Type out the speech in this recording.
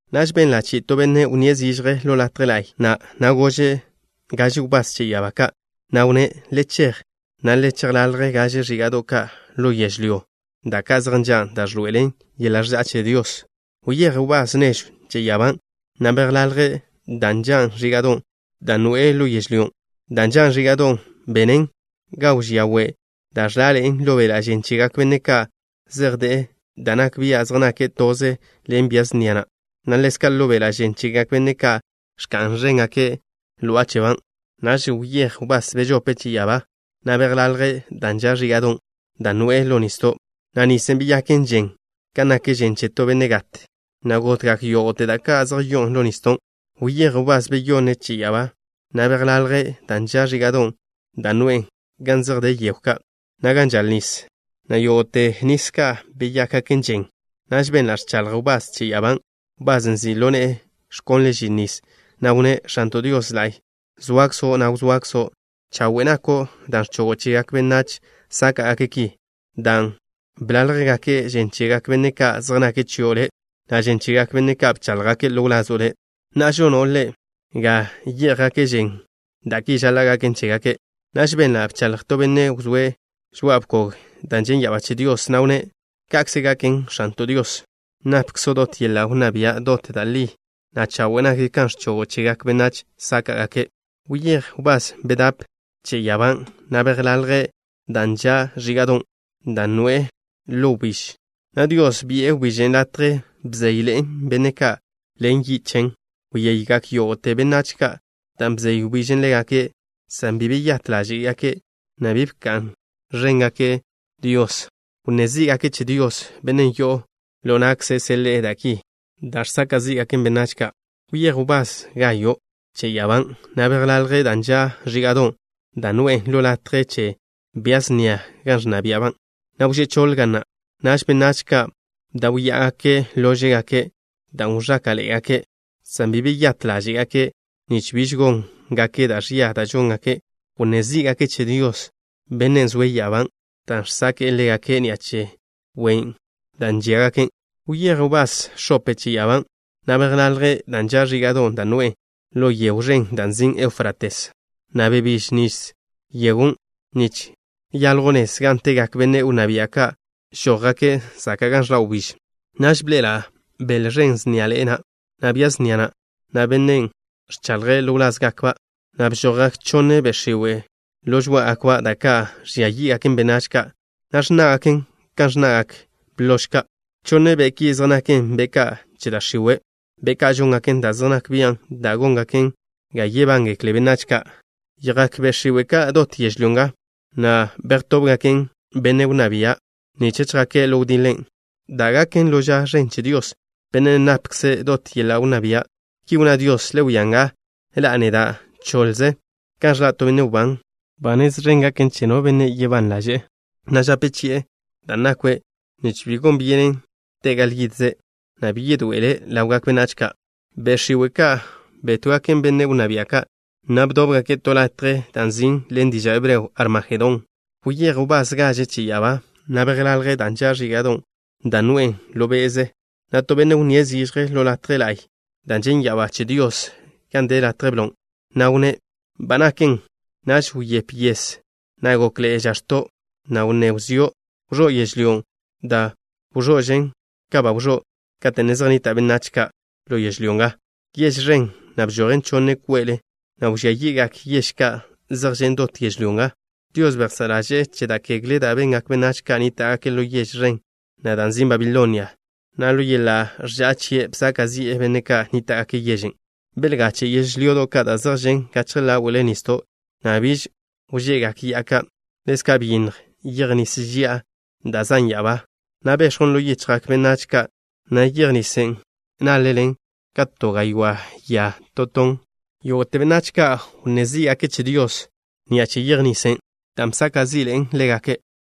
Naž benla' chi'i to benne' wnníe' zižje ḻo latje la'y na', na' gože' gaže wbás che ya'abá ka', na' wnné': “Le chej, na' le chejḻalje gaže ẕíga'do' ka' ḻo yežlyó, da' ka' zej nžan' da' ẕḻoe'elen yeḻa' ẕža'a che Dios.” Wyéj wbás nežw che ya'abá, na' bejḻalje' da' nžan' ẕíga'don' da' noe'e ḻo yežlyó. Da' nžan' ẕíga'don' benen ga wžía we' da' ẕlaḻe'en ḻo beḻa' žen chegak benne' ka' zej de'e da' nak bia' zej nake' toze ḻen bia snia na', na' ḻezka' ḻo beḻa' žen chegak benne' ka' ẕka'n ẕéngake' ló'aba'. Naž wyéj wbás bežope' che ya'abá, na' bejḻalje' da' nža' ẕíga'don' da' noe'e ḻo nisdo', na' nisen' beyaken žen kan nak žen che to benne' gat, na' gotgak yógo'te da' ka' zej yo'on ḻo nisdon'. Wyéj wbás beyonne' che ya'abá, na' bejḻalje' da' nža' ẕíga'don' da' noe'e gan zej de yegw ka', na' gan žal nis, na' yógo'te nis ka' beyákgaken žen. Naž benla' ẕchaḻj wbás che ya'abán', wbasen' nzi' ḻo ne'e ẕkonle' žin nis, na' wnné': “X̱anto' Dios La'y. Zoakzo', na' wzoakzo'. Chawe' nako' dan' ẕchogo' chegak benách sáka'gake' ki, dan' bláljgake' žen chegak benne' ka' zej nake' chio' Le', na' žen chegak benne' ka' bcháḻjgake' ḻo wlazo' Le'. Na'a, žono' Le' ga yé'jgake' žen dan' ki žaḻa' gaken chégake'.” Naž benla' bchaḻj to benne' wzóe' žoa'a bkogen' da' žen' ya'abá che Dios, na' wnné': “Ka'kze gaken, X̱anto' Dios, napkzo' dot yeḻa' wnná bia'. Dot da' li, na' chawe' nak kan ẕchogo' chegak benách sáka'gake'.” Wyéj wbás bedape' che ya'abá, na' bejḻalje' da' nža' ẕíga'don' da' noe'e ḻo wbíž, na' Dios bi'e wbižen' latje bzeyḻe'en benne' ka' ḻen yi' chen. Wyeygak yógo'te benách ka' dan' bzey wbíž ḻégake', san bi beyát ḻáže'gake', na' bi bka'n ẕéngake' Dios. Wnné zí'gake' che Dios, Bennen' yo'o ḻo na'kze' seḻe'e da' ki da' žsaka' zí'gaken benách ka'. Wyéj wbás gayo' che ya'abá, na' bejḻalje' da' nža' ẕíga'don' da' noe'e ḻo latje che bia snia gan ẕnna bia'ba', na' wžé' choḻ ga na'. Naž, benách ka' bdáwya'agake' lóže'gake' dan' wẕáka'ḻe'egake', san bi beyát ḻáže'gake' nich biž góngake' da' ẕia da' žóngake'. Wnné zí'gake' che Dios, Bennen' zoe' ya'abá dan' ẕzáka'ḻe'egake' ni'a che wen' da' žíagake'. Wyéj wbás x̱ope che ya'abá, na' bejḻalje' da' nža' ẕíga'don' da' noe'e ḻo yegw ẕen da' nzin' Eufrates, na' bebíž nis yegon' nich yaljw nez gan tegak benne' wnná bia' ka' žójgake' zaka' gan ẕḻa' wbíž. Naž bḻe'ela' bele ẕen sniaḻe'e na', na' bia snia na', na' bennen' ẕchaḻje' ḻo wlázgakba', na' bžojgak chonne be' x̱iwe' ḻo žoá'agakba', da' ka' ẕžia yí'gaken benách ka', na' ẕnná'gaken kan ẕnna'gak blož ka'. Chonne be' ki zej naken be' ka' che da' x̱iwe', be' ka' žóngaken da' zej nak bian' da' góngaken ga yebángekle benách ka'. Yjak be' x̱iwe' ka' dot yežlyó nga, na' bejtóbgaken benne' wnná bia' ka' nich chjake' ḻo wdiḻen' da' gaken ḻo ža ẕen che Dios, Bennen' napkze' dot yeḻa' wnná bia'. Ki wnná Dios: “Le wia nga. Ḻa'a neda' choḻze kan ẕḻa' to benne' wbán. Ba nez ẕen gaken che no benne' nake' ban ḻaže', na' žape chi'e da' nakwe', nich bi gon byenen te' gal yidze', na' bi yedoe'ele' ḻawgak benách ka'.” Be' x̱iwe' ka' betóbgaken benne' wnná bia' ka', na' bdóbgake' to latje da' nzin' ḻen diža' hebreo: Armajedón. Wyéj wbás gaže' che ya'abá, na' bejḻalje' da' nža' ẕíga'don' da' noe'e ḻo be'ze, na' to benne' wnníe' zižje ḻo latje la'y da' žen' ya'abá che Dios gan de latje blon', na' wnné': “Ba naken.” Naž wyép yes, na' gokḻe'e žax̱to', na' wnné wzió'. Wẕó' yežlyó, da' wẕo'žen ka ba wẕó' kate' ne zej nnita' benách ka' ḻo yežlyó nga. Yež ẕen na' bžojen chonne kwe'le, na' wẕía yi'gak yež ka' zej žen' dot yežlyó nga. Dios bejsá' ḻaže'e che da' ẕia da' bengak benách ka' nníta'gake' ḻo yež ẕen na' da' nzin' Babilonia, na' ḻo yeḻa' ẕža'a chie' bsaka' zi'e benne' ka' nníta'gake' yežen'. Belgache' yežlyodo' ka' da' zej žen' gachje ḻawle nisdo', na' biž wže'gak ya'a ka'. Ḻezka' byinnj yej nis ži'a, da' zan' ya'abá, na' bex̱jwn ḻo yichjgak benách ka', na' yej nisen' nále'len ka to gaywá' ya to ton. Yógo'te benách ka' wnné zí'gake' che Dios ni'a che yej nisen', dan' bsaka' zi'ḻe'en ḻégake'.